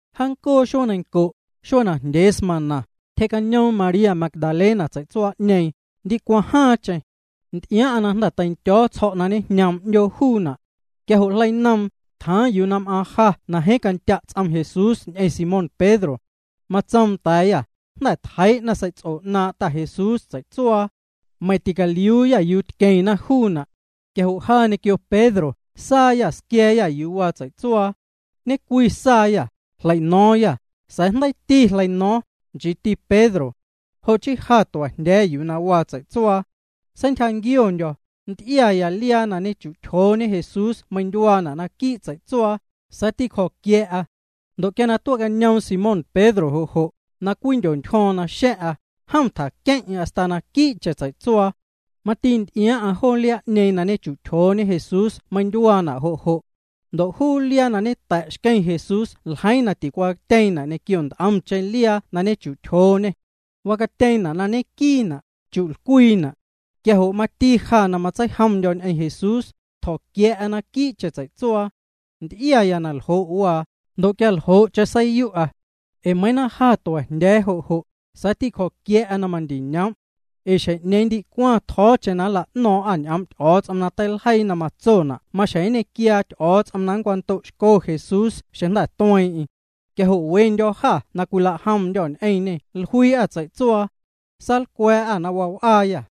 Jaancoo xuee neiⁿnco', xuee najndyee smaⁿna, tyjee'cañoom María Magdalena tsei'tsuaa'ñeeⁿ, ndicwaⁿ jaaⁿcheⁿ. Nty'iaaⁿ'aⁿ na jnda̱ teindyo̱ tsjo̱' na ñejñoom 'ndyoo juuna'. Quia jo' jleinoom, tjaaⁿ yuu na m'aaⁿ ja na jeeⁿ candya' ts'om Jesús ñ'eⁿ Simón Pedro. Matsoom nda̱a̱yâ: —Jnda̱ tjeii'na sei'ts'o 'naaⁿ' Ta Jesús tsei'tsuaa, meiⁿ ticaliuuyâ yuu tqueⁿna juuna'. Quia jo' ja ñequio Pedro saayâ, squia̱a̱yâ yuu waa tsei'tsuaa. Ñe'cwi saayâ, jleino̱o̱ⁿyâ, sa̱a̱ jndeiiti jleino̱o̱ⁿ, nchiiti Pedro. Jo' chii ja tua̱jndya̱a̱ya yuu waa tsei'tsuaa. Seintyjanquiondyo̱, nty'iaya liaa na ñechu'tyjooñe Jesús meindyuaana' naquii' tsei'tsuaa, sa̱a̱ tîcjo̱quia̱'a. Ndo' quia na tuee'cañoom Simón Pedro jo' jo', na cwijndyontyjo̱o̱ⁿ naxa̱ⁿ'a, jom tjaqueⁿ'eⁿ hasta naquii'cheⁿ tsei'tsuaa. Mati nty'iaaⁿ'aⁿ joo liaa'ñeeⁿ na ñechu'tyjooñe Jesús meindyuaana' jo' jo'. Ndo' juu liaa na ñeta̱' xqueⁿ Jesús ljeiiⁿ na ticwacatyeeⁿna' ñequio nt'omcheⁿ liaa na ñechu'tyjooñê. Wacatyeeⁿna' na ñenquiina', chi'lcwiina'. Quia jo' mati ja na matseijomndyo̱ ñ'eⁿ Jesús, tjo̱quia̱'a naquii'cheⁿ tsei'tsuaa. Nty'iaya na ljo' waa, ndo' quia ljo'cheⁿ seiyu'a. Ee meiiⁿ na ja tua̱jndya̱a̱ jo' jo', sa̱a̱ tîcjo̱quia̱'a na mandiñoom'. Ee xjeⁿ'ñeeⁿ ndicwaⁿ tjo̱o̱cheⁿ nla'no̱o̱ⁿ'â ñ'oom' Ty'o̱o̱ts'om na teiljeii na matsona' maxjeⁿ nñequiaa Ty'o̱o̱ts'om na nncwando'xco Jesús xeⁿ jnda̱ tue'. Quia jo' wendyô̱ jâ na cwilajomndyô̱ ñ'eⁿñê jluii'â tsei'tsuaa. Saalcwa̱a̱'â na waa w'aayâ.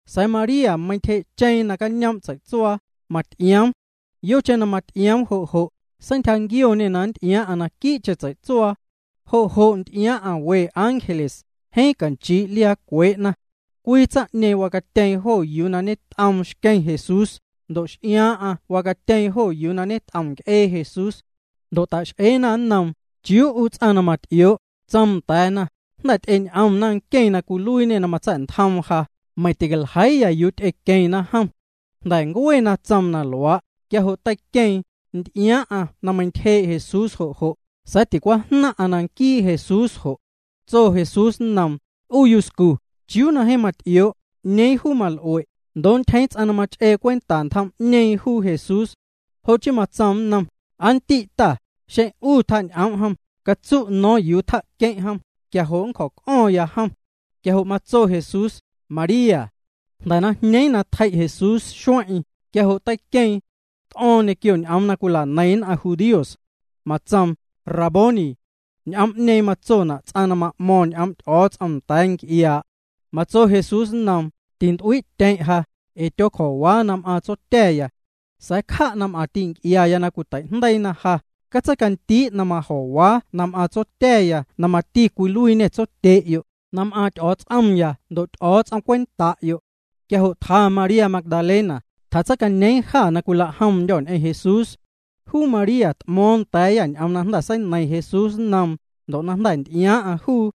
Sa̱a̱ María meintyjee'cheeⁿ nacañoom' tsei'tsuaa, maty'ioom. Yocheⁿ na maty'ioom jo' jo', seintyjanquioñê na nty'iaaⁿ'aⁿ naquii'cheⁿ tsei'tsuaa. Jo' jo' nty'iaaⁿ'aⁿ we ángeles, jeeⁿ canchii' liaa cwee'na. Cwii tsaⁿ'ñeeⁿ wacatyeeⁿ jo yuu na ñet'oom xqueⁿ Jesús, ndo' x'iaaⁿ'aⁿ wacatyeeⁿ jo yuu ñet'om nc'ee Jesús. Ndo' ta'x'eena nnoom: —¿Chiuu 'u ts'aⁿ na maty'ioo'? Tsoom nda̱a̱na: —Jnda̱ ty'eñ'omna nqueⁿ na cwiluiiñê na matsa̱'ntjoom ja, meiⁿ ticaljeiiya yuu ty'equeⁿna jom. Jnda̱ ncue na tsoom na luaa', quia jo' teiqueeⁿ, nty'iaaⁿ'aⁿ na meintyjee' Jesús jo' jo', sa̱a̱ ticwajnaⁿ'aⁿ na nquii Jesús jo'. Tso Jesús nnoom: —'U yuscu, ¿chiuu na jeeⁿ maty'ioo'? ¿'Ñeeⁿ juu mal'ue'? Ndoo' ntyjeeⁿ ts'aⁿ na mach'ee cwenta ntjom'ñeeⁿ juu Jesús. Jo' chii matsoom nnom: —Aa ndi' ta, xeⁿ 'u tjañ'oom' jom, catsu' no̱o̱ⁿ yuu tja'queⁿ' jom, quia jo' nncjo̱c'o̱ⁿya jom. Quia jo' matso Jesús: —María. Jnda̱ na jñeeⁿ na tjei' Jesús xueⁿ'eⁿ, quia jo' teiqueeⁿ. T'o̱o̱ⁿ ñequio ñ'oom na cwila'neiⁿ nn'aⁿ judíos. Matsoom: —Raboni. Ñ'oom'ñeeⁿ matsona' ts'aⁿ na ma'mo̱ⁿ ñ'oom' Ty'o̱o̱ts'om nda̱a̱ nc'iaa'. Matso Jesús nnoom: —Tint'uii'tyeⁿ' ja, ee tyoocjo̱waa na m'aaⁿ Tsotya̱ya. Sa̱a̱ cja' na m'aⁿ ti'nc'iaya na cwiteijndeiina ja, catseicandii' na majo̱waa na m'aaⁿ Tsotya̱ya na mati cwiluiiñê Tsotye'yo', na m'aaⁿ Ty'o̱o̱ts'omya ndo' Ty'o̱o̱ts'om cwenta'yo'. Quia jo' tja María Magdalena, tjatseicañeeⁿ jâ na cwilajomndyô̱ ñ'eⁿ Jesús. Juu María t'mo̱o̱ⁿ nda̱a̱yâ ñ'oom na jnda̱ seineiⁿ Jesús nnoom, ndo' na jnda̱ nty'iaaⁿ'aⁿ juu.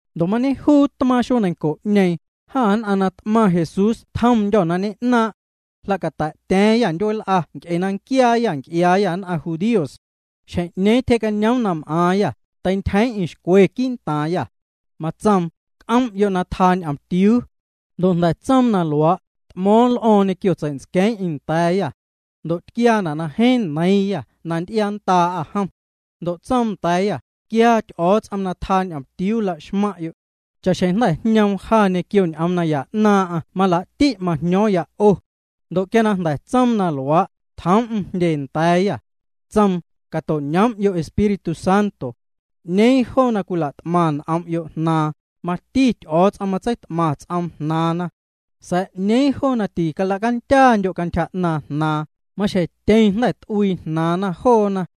Ndo' mañejuu tmaaⁿ xuee neiⁿnco'ñeeⁿ, jâ nn'aⁿ na t'maⁿ Jesús tjomndyô̱ na ñe'naaⁿ'. Jla'cata̱'tya̱a̱ⁿyâ ndyueel'a nc'e na nquiaayâ nc'iaaya nn'aⁿ judíos. Xjeⁿ'ñeeⁿ tyjee'cañoom na m'aaⁿyâ, teintyjeeⁿ'eⁿ xcwe quii'ntaaⁿyâ. Matsoom: —C'oom'yo' na tjaa ñomtiuu. Ndo' jnda̱ tsoom na luaa', t'mo̱o̱ⁿ l'o̱o̱ⁿ ñequio tsei'ntsqueeⁿ'eⁿ nda̱a̱yâ. Ndo' tquiaana' na jeeⁿ neiiⁿyâ na nty'iaanndaa'â jom. Ndo' tsoom nda̱a̱yâ: —Quiaa Ty'o̱o̱ts'om na tjaa ñomtiuu laxmaⁿ'yo'. Cha'xjeⁿ jnda̱ jñoom ja ñequio ñ'oom naya 'naaⁿ'aⁿ malaa'ti' majño̱o̱ⁿya 'o. Ndo' quia na jnda̱ tsoom na luaa', tjoom'm jndye nda̱a̱yâ. Tsoom: —Cato'ñoom'yo' Espíritu Santo. 'Ñeeⁿ joo na cwilat'maⁿ n'om'yo' jnaaⁿ, mati Ty'o̱o̱ts'om matseit'maⁿ ts'oom jnaaⁿna. Sa̱a̱ 'ñeeⁿ joo na ticalacandyaandyo' cantyja 'naaⁿ jnaaⁿ, maxjeⁿ tyeⁿ jnda̱ t'uii jnaaⁿna joona.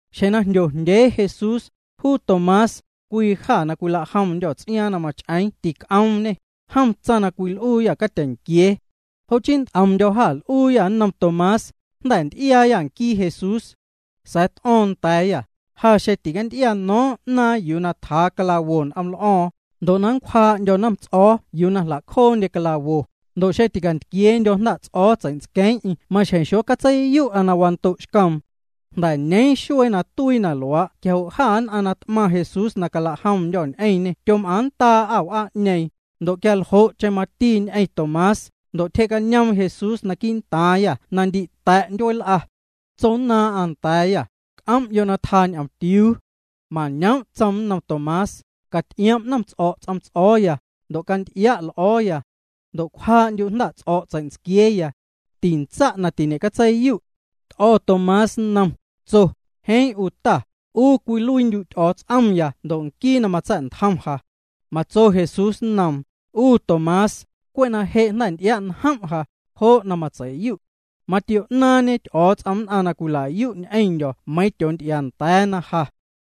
Xjeⁿ na jndyojndyee Jesús, juu Tomás, cwii jâ na cwilajomndyô̱ ts'iaaⁿ na mach'eeⁿ tic'oomñê, jom tsaⁿ na cwil'uuyâ catyeⁿnquiee. Jo' chii nt'omndyô̱ jâ l'uuyâ nnom Tomás: —Jnda̱ nty'iaayâ nquii Jesús. Sa̱a̱ t'o̱o̱ⁿ nda̱a̱yâ: —Ja xeⁿ ticanty'iano̱o̱ⁿ 'naaⁿ yuu na tjaa clavos n'oml'o̱o̱ⁿ, ndo' na nncwjaa'ndyo̱ nnomts'o̱o̱ yuu na jla'cjoondye clavos, ndo' xeⁿ ticantquieendyo̱ jnda'ts'o̱o̱ tsei'ntsqueeⁿ'eⁿ maxjeⁿ xocatseiyu'a na wando'xcoom. Jnda̱ ñeeⁿ xuee na tuii na luaa' quia jo' jâ nn'aⁿ na t'maⁿ Jesús na calajomndyô̱ ñ'eⁿñê tyom'aaⁿnndaa'â w'aa'ñeeⁿ, ndo' quia ljo'cheⁿ mati ñ'eⁿ Tomás. Ndo' tyjee'cañoom Jesús naquii' ntaaⁿyâ na ndi ta̱' ndyueel'a. Tsonnaaⁿ'aⁿ nda̱a̱yâ: —C'om'yo' na tjaa ñomtiuu. Mañoom' matsoom nnom Tomás: —Caty'iom' nnomts'o̱' ts'om ts'o̱o̱ya, ndo' canty'ia' l'o̱o̱ya. Ndo' cwjaa'ndyu' jnda'ts'o̱' tsei'ntsquieeya. Tantsa' na tiñe'catseiyu'. T'o̱ Tomás nnoom, tso: —Jeeⁿ 'u Ta, 'u cwiluiindyu' Ty'o̱o̱ts'omya ndo' nquii na matsa̱'ntjom ja. Matso Jesús nnoom: —'U Tomás, cwe' na je' jnda̱ nty'ia'njom' ja, jo' na matsei'yu'. Matio'naaⁿñe Ty'o̱o̱ts'om nn'aⁿ na cwila'yu' ñ'eⁿndyo̱ meiiⁿ tyoonty'iaanda̱a̱na ja.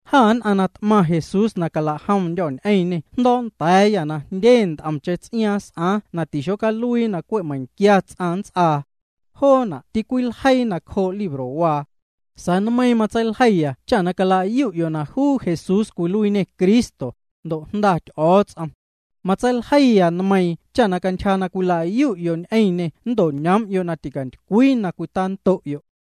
Jâ nn'aⁿ na t'maⁿ Jesús na calajomndyô̱ ñ'eⁿñê jndo̱o̱'nda̱a̱yâ na jndye nt'omcheⁿ ts'iaaⁿ s'aaⁿ na tixocaluii na cwe' meiⁿquia ts'aⁿ nnts'aa. Joona' tîcwiljeii nacjoo' librowaa. Sa̱a̱ nmeiiⁿ matseiljeiya cha na calayu'yo' na juu Jesús cwiluiiñê Cristo, ndo' Jnda Ty'o̱o̱ts'om. Matseiljeiya nmeiiⁿ cha cantyja na cwilayu'yo' ñ'eⁿñê nnto'ñoom'yo' na ticantycwii na cwitando'yo'.